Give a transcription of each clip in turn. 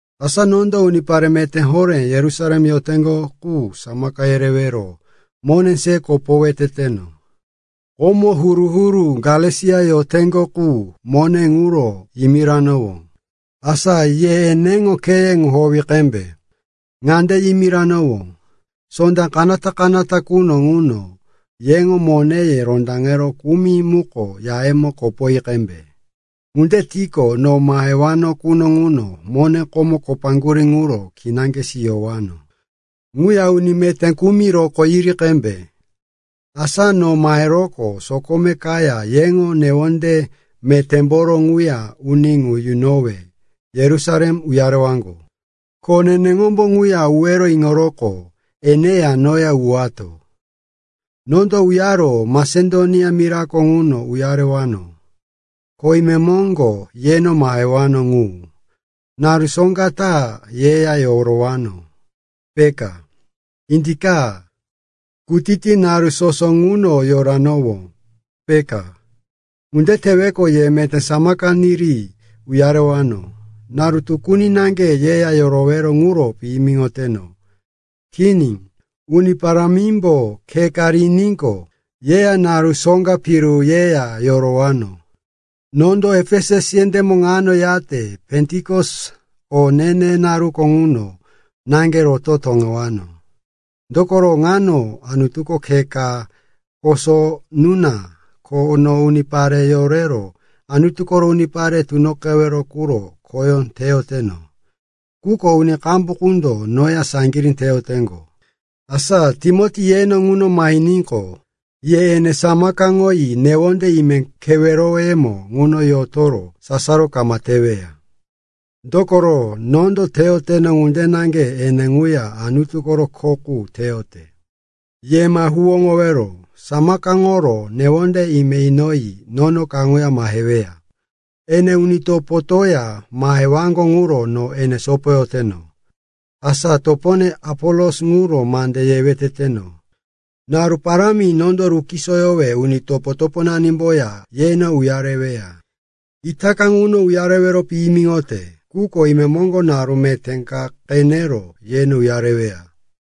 Asa nondo unipare meté horé Yerusalem yoteŋgo qu samaka yerewero mone se kopowe teteno. Komo huru-huru Galesia yoteŋgo qu mone ŋuro yimiranowó, asa ye eneŋo kheye ŋu howi qembe. Ŋande yimiranowó: Sonda kanata-kanata quno ŋuno yeŋo moneye rondaŋero kumi muko yayemo kopoyi qembe. Ŋunde tiqo, no mahewano quno ŋuno mone komo kopaŋgurí ŋuro kinaŋge siyowano. Ŋuya uni meté kumi rokó yiri qembe. Asa no maheroqo sokome kaya yeŋo newonde metémboro ŋuya uni ŋu yunowe Yerusalem uyarewaŋgo. Ko neneŋombo ŋuya uwero iŋoroqo eneya noya uwato. Nondo uyaro Masedonia mirako ŋuno uyarewano, ko imemoŋgo yeno mahewano ŋu. Naru soŋga ta yeya yorowano, peka. Indika, kutiti naru soso ŋuno yorowano, peka. Ŋunde teweqo, ye meté samaka niri uyarewano. Naru tukuni naŋge yeya yorowero ŋuro piyimiŋoteno. Kini, Uni Parámimbo khe ka riníqo, yeya naru soŋga piru yeya yorowano. Nondo Efesus yendémo ŋano yate Pentikos o ne-ne naruko ŋuno naŋge roto toŋewano. Dokoro, ŋano Anutuko khe ka koso nuna, ko no unipare yorero Anutu koro unipare tunoqewero quro khoyó teyoteno. Quko uni qambu qundo noya saŋgirí teyoteŋgo. Asa Timoti yeno ŋuno mahiníqo, ye ene samakaŋoyi newonde ime keweroyemo ŋuno yotoro sasaro kama teweya. Dokoro nondo teyoteno ŋunde naŋge ene ŋuya Anutu koro kho qu teyote. Ye ma huwóŋowero. Samakaŋoro newonde ime inoyi nono kaŋuya maheweya. Ene uni topotoya mahewaŋgo ŋuro no ene sopoyoteno. Asa topone Apolos ŋuro mande yewe teteno. Naru parámi nondo rukisoyowe uni topo-toponanimboya yeno uyareweya. Itaka ŋuno uyarewero piyimiŋote, quko imemoŋgo naru meté ka qenero yeno uyareweya.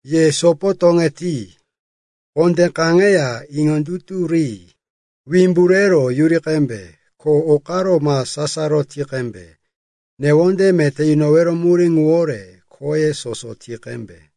Ye sopo toŋeti, kondé kaŋeya iŋondutu ri. Wimbu rero yuri qembe, ko o karo ma sasaro ti qembe. Newonde meté yunowero murí ŋuwore khoye soso ti qembe.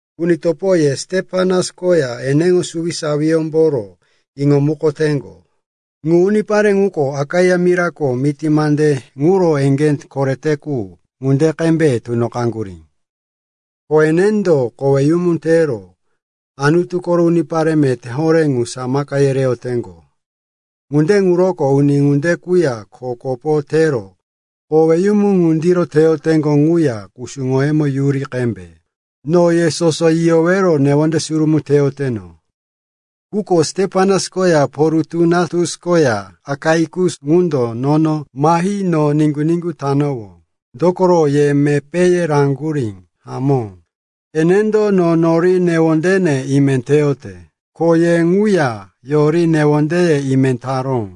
Uni topo, ye Stepanas koya eneŋo suwisawiyómboro iŋomukoteŋgo. Ŋu unipare ŋuko Akaia mirako miti mande ŋuro eŋgé korete qu ŋunde qembe tunoqaŋgurí. Ko enendo koweyumu tero Anutu koro unipare meté horé ŋu samaka yereyoteŋgo. Ŋunde ŋuroko uni ŋunde quya kho kopo tero koweyumu ŋundiro teyoteŋgo quya kusuŋoyemo yuri qembe. No ye soso yiyowero newonde surumí teyoteno. Quko Stepanas koya Porutunatus koya Akaikus ŋundo nono mahi no niŋgu-niŋgu tanowó, dokoro ye mepéye raŋgurí. Hamó, enendo no nori newondene ime teyote, ko ye ŋuya yori newondeye ime taró.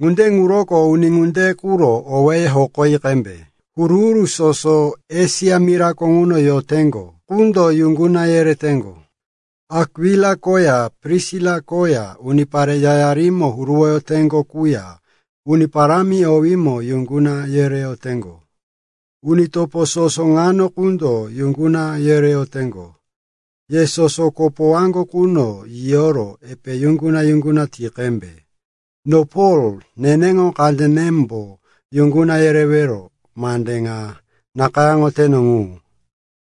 Ŋunde ŋuroko uni ŋunde quro owéye hokoyi qembe. Huru-huru soso Esia mirako ŋuno yoteŋgo qundo yuŋguna yereyoteŋgo. Akwila koya Prisila koya unipare yayarimo huruwoyoteŋgo quya Uni Parámi owímo yuŋguna yereyoteŋgo. Uni topo soso ŋano qundo yuŋguna yereyoteŋgo. Ye soso kopowaŋgo quno yiyoro epe yuŋguna-yuŋguna ti qembe. No Pol, neneŋo kandenembo yuŋguna yerewero mande ŋa nakayáŋoteno ŋu.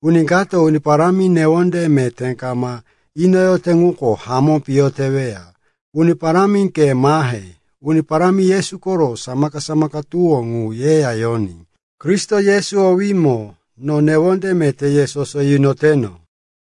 Uni kato Uni Parámi newonde meté kama inoyote ŋuko hamó piyo teweya. Uni Parámi, ke mahe. Uni Parámi Yesu koro samaka-samaka tuwó ŋu yeya yoní. Kristo Yesu owímo no newonde meté ye soso yunoteno.